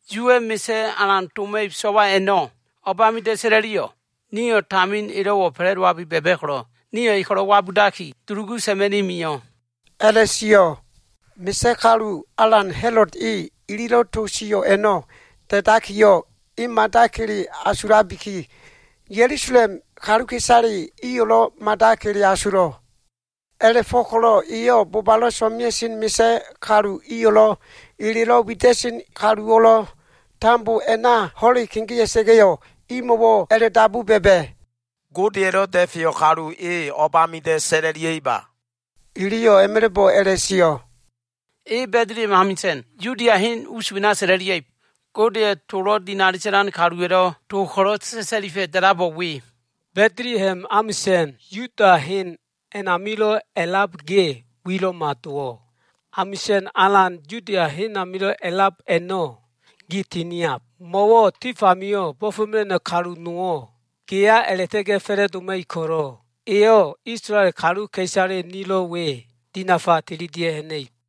“Yuwa꞉ misa꞉ alan doma꞉ib so꞉wa a꞉no꞉ o꞉bamida꞉ sa꞉la꞉liyo꞉? Nio꞉ tamin elo꞉wo꞉ fa꞉la꞉dowabi ba꞉ba꞉ ko꞉lo꞉, nio꞉ e ko꞉lo꞉ wabudaki dulugu sa꞉ma꞉ni mio꞉” a꞉la꞉sio꞉. Misa꞉ kalu alan Ha꞉lod e ililo꞉ to sio꞉ a꞉no꞉ da꞉dakiyo꞉, e mada kele asulabiki, Ya꞉lusalem kaluka꞉isale iyo꞉lo꞉ mada kele asulo꞉. A꞉la꞉fo꞉ko꞉lo꞉ eyo꞉ bobalo꞉ so꞉mea꞉sen misa꞉ kalu iyo꞉lo꞉, elelo꞉ wida꞉sen kaluwo꞉lo꞉ tambo a꞉na ho꞉le kegea꞉sa꞉ga꞉yo꞉, imo꞉wo꞉ a꞉la꞉dabu ba꞉ba꞉, “Godeya꞉lo꞉ da꞉feyo꞉ kalu e o꞉bamida꞉ sa꞉la꞉lia꞉iba?” Iliyo꞉ a꞉ma꞉la꞉bo꞉ a꞉la꞉sio꞉, “E Ba꞉diliha꞉m amisa꞉n, Yudia hen us wena sa꞉la꞉lia꞉ib. Godeya꞉ tolo꞉ dinali sa꞉lan kaluwa꞉lo꞉ to ko꞉lo꞉ sa꞉sa꞉lifa꞉ da꞉labo꞉ we, “Ba꞉diliha꞉m amisa꞉n, Yuda hen amio꞉lo꞉ a꞉lab ge, wilo꞉ma dowo꞉. Amisa꞉n alan Yuda hen a꞉namilo꞉ a꞉lab a꞉no꞉ gi tiniab. Mo꞉wo꞉ tif amio꞉ bo꞉fo꞉mela꞉no꞉ kalu nowo꞉ geya a꞉la꞉ta꞉ga꞉ fa꞉la꞉doma꞉ib ko꞉lo꞉, eyo꞉ Isolael kaluka꞉isale nilo꞉ we, dinafa tililia꞉ ha꞉na꞉ib.”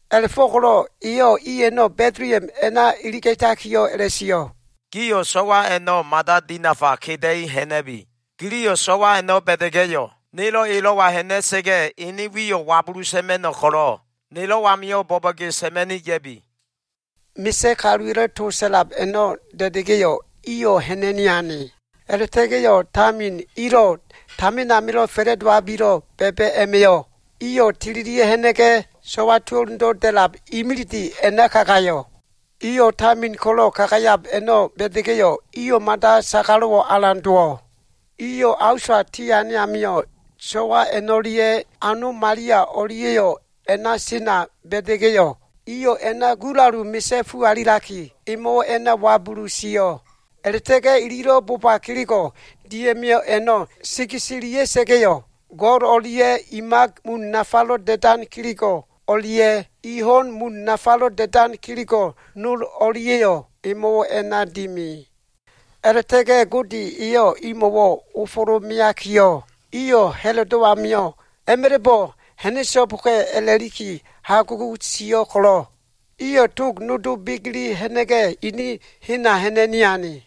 A꞉la꞉fo꞉ko꞉lo꞉ eyo꞉ i a꞉no꞉ Ba꞉diliha꞉m a꞉na iliga꞉takiyo꞉ a꞉la꞉sio꞉, “Gio꞉ so꞉wa a꞉no꞉ mada dinafa keda꞉i ha꞉na꞉bi. Giliyo꞉ so꞉wa a꞉no꞉ ba꞉da꞉ga꞉yo꞉, nelo꞉ elo꞉wa ha꞉na꞉sa꞉ga꞉ ene wiyo꞉ wabulu sa꞉ma꞉no꞉ ko꞉lo꞉ nelo꞉ amio꞉ bo꞉bo꞉ge sa꞉ma꞉ni ya꞉bi.” Misa꞉ kaluwa꞉lo꞉ to sa꞉lab a꞉no꞉ da꞉da꞉ga꞉yo꞉, iyo꞉ ha꞉na꞉ni ane. A꞉la꞉ta꞉ga꞉yo꞉ tamin ilo꞉ tamin amilo꞉ fa꞉ladowabilo꞉ ba꞉ba꞉ a꞉ma꞉yo꞉, iyo꞉ tililia꞉ ha꞉na꞉ga꞉, so꞉wa tuo꞉lundo꞉ da꞉lab imilide a꞉na kagayo꞉. Iyo꞉ tamin ko꞉lo꞉ kagayab a꞉no꞉ ba꞉da꞉ga꞉yo꞉, iyo꞉ mada sagalo꞉wo꞉ alan dowo꞉ Iyo꞉ a usa tiane amio꞉, so꞉wa a꞉no꞉lia꞉ ano Malia o꞉lia꞉yo꞉ a꞉na sena ba꞉da꞉ga꞉yo꞉, iyo꞉ a꞉na gulalu misa꞉fu alitaki, emo꞉wo꞉ a꞉na wabulu sio꞉. A꞉la꞉ta꞉ga꞉ ililo꞉ boba kelego꞉ dia꞉mio꞉ a꞉no꞉ segeselia꞉sa꞉ga꞉yo꞉, go꞉l o꞉lia꞉ i mak mun nafalo꞉ da꞉dan kelego꞉ o꞉lia꞉, i ho꞉n mun nafalo꞉ da꞉dan kelego꞉ no o꞉lia꞉yo꞉ emo꞉wo꞉ a꞉na dimi. A꞉la꞉ta꞉ga꞉ Gode eyo꞉ imo꞉wo꞉ ofolo꞉ meakiyo꞉, iyo꞉ Ha꞉lodo꞉ amio꞉ a꞉ma꞉la꞉bo꞉ ha꞉na꞉so꞉boka꞉ a꞉la꞉likiyo꞉ hagugu sio꞉ ko꞉lo꞉, iyo꞉ tog nodo begele ha꞉na꞉ga꞉, ini hena ha꞉na꞉ni ane.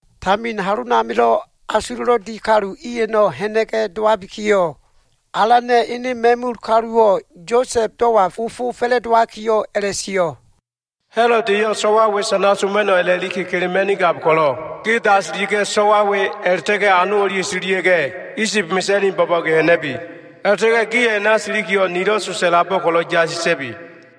Tamin halonamilo꞉ asulo꞉lo꞉ di kalu i a꞉no꞉ ha꞉na꞉ga꞉ dowabikiyo꞉, Alana꞉ ene ma꞉mul kaluwo꞉ Yosa꞉b dowa ofo fa꞉la꞉dowakiyo꞉ a꞉la꞉sio꞉, “Ha꞉lod eyo꞉ so꞉wa we sanala꞉ma꞉no꞉ a꞉la꞉liki kelema꞉nigab ko꞉lo꞉, ge dasilia꞉ga꞉, so꞉wa we a꞉la꞉ta꞉ga꞉ ano o꞉lia꞉yo꞉ tililia꞉ga꞉, Isib mesa꞉ni bo꞉bo꞉ge ha꞉na꞉bi. A꞉la꞉ta꞉ga꞉ gio꞉ a꞉na silikiyo꞉, nilo꞉ to sa꞉labo꞉ ko꞉lo꞉ yasi sa꞉bi.”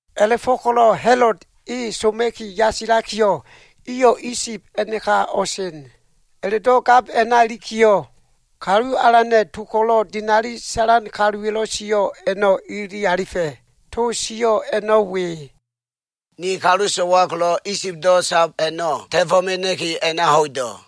A꞉la꞉fo꞉ko꞉lo꞉ Ha꞉lod e soma꞉ki yasilakiyo꞉, iyo꞉ Isib a꞉naka o꞉sen. A꞉la꞉do꞉ gab a꞉na ilikiyo꞉, Kalu Alana꞉ to ko꞉lo꞉ dinali sa꞉lan kaluwa꞉lo꞉ sio꞉ a꞉no꞉ ilili alifa꞉. To sio꞉ a꞉no꞉ we, “Ni kalu so꞉wa ko꞉lo꞉ Isibdo꞉ sab a꞉no꞉, ta꞉fo꞉ mena꞉ki a꞉na ho꞉ido꞉.”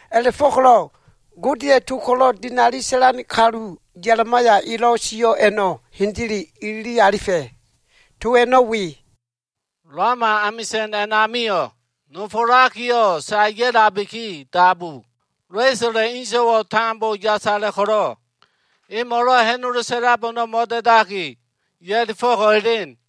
A꞉la꞉fo꞉ko꞉lo꞉ Godeya꞉ to ko꞉lo꞉ dinali sa꞉lan kalu Ya꞉limaya elo꞉ sio꞉ a꞉no꞉ hendele ilili alifa꞉. To a꞉no꞉ we, “Lama amisa꞉n a꞉namio꞉ nofolakiyo꞉ sae ya꞉labiki dabu. Lesola꞉ inso꞉wo꞉ tambo yasala꞉ ko꞉lo꞉, emo꞉lo꞉ ha꞉nolo sa꞉lab a꞉no꞉ mo꞉da꞉daki, ya꞉lifo꞉ko꞉ elen.”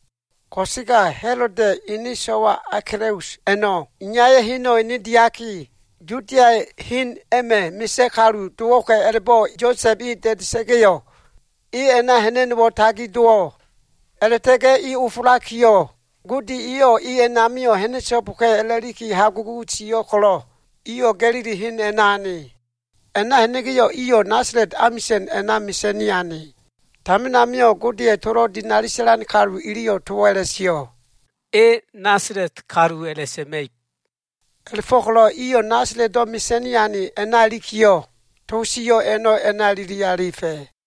Ko꞉sega Ha꞉loda꞉ ene so꞉wa Akelaus a꞉no꞉ iyaya꞉ heno꞉ ene diaki, Yudia hen a꞉ma꞉ misa꞉ kalu dowo꞉ka꞉ a꞉la꞉bo꞉ Yosa꞉b e da꞉da꞉sa꞉ga꞉yo꞉, e a꞉na ha꞉na꞉no꞉wo꞉ tagi dowo꞉. A꞉la꞉ta꞉ga꞉ e ofolakiyo꞉, Gode eyo꞉ e a꞉namio꞉ ha꞉na꞉so꞉boka꞉ a꞉la꞉liki hagugu sio꞉ ko꞉lo꞉, iyo꞉ Ga꞉lili hen a꞉na ane. A꞉na ha꞉na꞉ga꞉yo꞉, iyo꞉ Nasala꞉t amisa꞉n a꞉na mesa꞉ni ane. Tamin amio꞉ Godeya꞉ tolo꞉ dinali sa꞉lan kalu iliyo꞉ towo꞉ a꞉la꞉sio꞉, “E Nasala꞉t kalu a꞉la꞉sa꞉ma꞉ib.” A꞉la꞉fo꞉ko꞉lo꞉ iyo꞉ Nasala꞉tdo꞉ mesa꞉ni ane a꞉na ilikiyo꞉, to sio꞉ a꞉no꞉ a꞉na ilili alifa꞉.